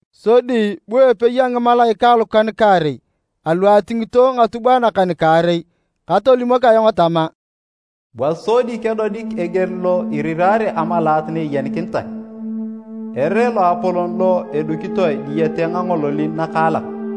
Sodi bu epei a ngimalaikae alukan-kaarei alu atingito ngatubwae nakan-kaarei katolimok ayong tama, “Bua sodi kedodik eger lo iriraare amalaat na eyenikinitae, ere loapolon lo edukitoe diyete ngangololin nakaalak.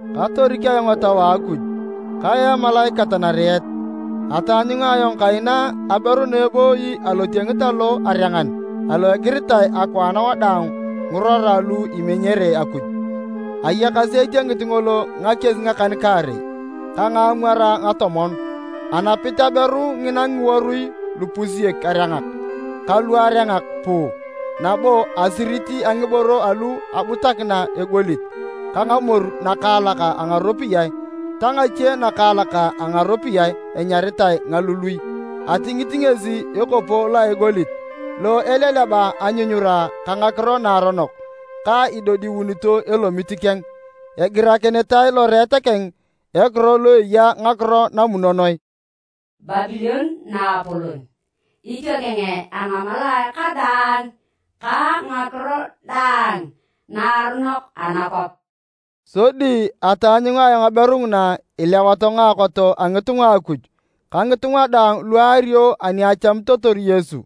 Katorik ayong Etau a Akuj kayaa emalaikat nariet. Ataanyunga ayong kaina aberu na ebooyi alotiengit alo a arengan alo egiritae akwaan wadaang ngirora lu imenyere Akuj. Ayakasi etiengit ngolo ngakies ngakan-kaarei ka ngaamwar ngatomon. Anapit aberu ngina ngiworui lupusiek arengak ka luarengak puu nabo asirit a ngiboro alu abutakina egolit ka ngamoru nakaalak a ngaropiyae ta ngache nakaalak a ngaropiyae enyaritae ngalului. Atingit ngesi ekopo lo a egolit lo eleleba anyunyura ka ngakiro naaronok na idodiunito elomit keng. Egirakinitae loreet keng ekiro lo eya ngakiro namunonoe, “Babilon naapolon, itiokeng a ngamalaae kadaang ka ngakiro daang naaronok anakwap.” Sodi ataanyunga aberu ngina ilewato ngaakot a ngitunga a Akuj ka ngitunga daang lu aario ani achamitotor Yesu.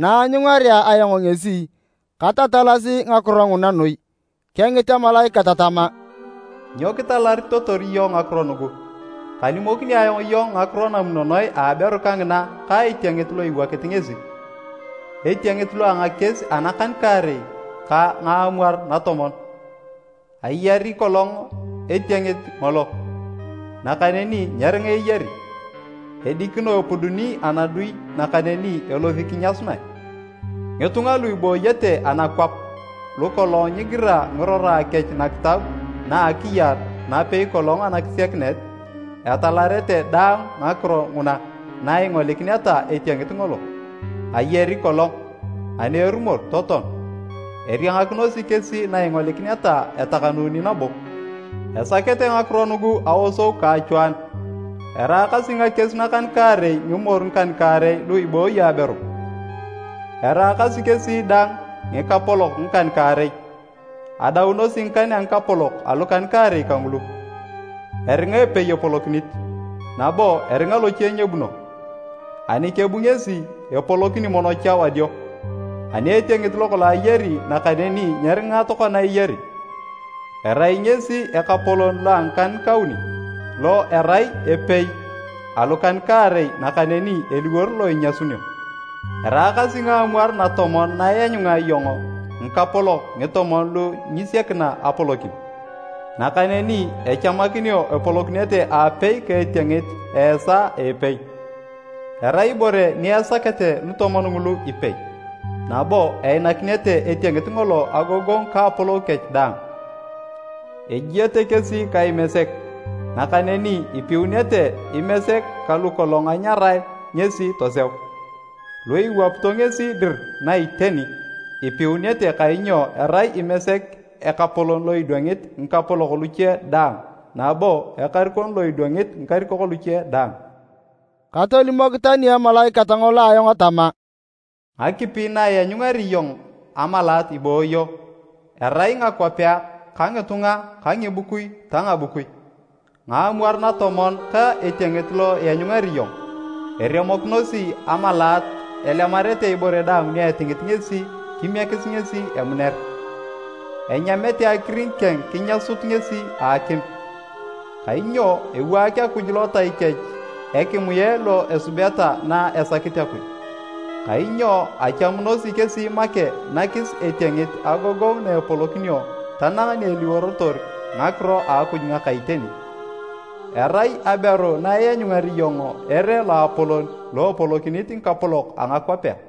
Na aanyungarea ayong ngesi, katatalasi ngakiro nguna noi. Kengit emalaikat tama, “Nyo kitalaritotor iyong ngakiro nugu? Kalimokini ayong iyong ngakiro namunonoe a aberu kangina ka etiengit lo iwokit ngesi, etiengit lo a ngakies anakan-kaarei ka ngaamwar natomon. Ayari kolong etiengit ngolo, nakaneni nyeringa eyari, edikino epuduni anadui nakaneni elosi kinyasunae. Ngitunga lu ibooyete anakwap lukolong nyigira ngirora kech nakitab na a akiyar napei kolong anakisiakinet, etalarete daang ngakiro nguna na ingolikineta etiengit ngolo. Ayari kolong, ani erumor totoan. Eriangakinosi kesi na ingolikineta etakanuni nabo. “Esakete ngakiro nugu aosou ka achwaanu. Eraakasi ngakies nakan-kaarei ngimoru ngikan-kaarei lu ibooyo aberu. Eraakasi kesi dang ngikapolok ngikan-kaarei, adaunosi ngikan a ngikapolok alukan-kaarei kangulu, eringa epei epolokinit, nabo eringa loche nyebuno. Ani kebu ngesi, epolokini mono cha wadio. Ani etiengit lokolong ayari nakaneni nyeringa tokona eyari, erai ngesi ekapolon lo a ngikan-kauni, lo erai epei alukan-kaarei nakaneni eliwor lo inyasunio. “Eraakasi ngaamwar natomon na ianyunga iyong ngikapolok ngitomon lu nyisiekina apolokin, nakaneni echamakinio epolokinete aapei ka etiengit a esaa a epei. Erai ibore ni esakete lutomon ngulu ipei, nabo einakinete etiengit ngolo agogongu ka apolou kech daang. Ejiete kesi ka Imesek, nakaneni ipiunete Imesek ka lu kolong anyarae ngesi toseu, lu iwapito ngesi dir na iteni, ipiunete kainyo erai Imesek Ekapolon lo idwangit ngikapolok luche daang nabo Ekarikon lo idwangit ngikarikok luche daang.” Katolimok tani emalaikat ngolo ayong tama, “Ngakipi na ianyungari iyong amalaat ibooyo, erai ngakwapea ka ngitunga ka ngibukui ta ngabukui. Ngaamwar natomon ka etiengit lo ianyungari iyong, eremokinosi amalaat elemarete ibore daang ni etingit ngesi kimiekis ngesi emuner. Enyamete akiring keng kinyasut ngesi a akim. Kainyo ewaak Akuj lotai kech ekimue lo esubeta na esakit Akuj, kainyo echamunosi kesi make nakis etiengit agogongu na epolokinio tanang ni eliworotor ngakiro a Akuj ngaka iteni. “Erai aberu na ianyungari iyong ere loapolon lo epolokinit ngikapolok a ngakwapea.”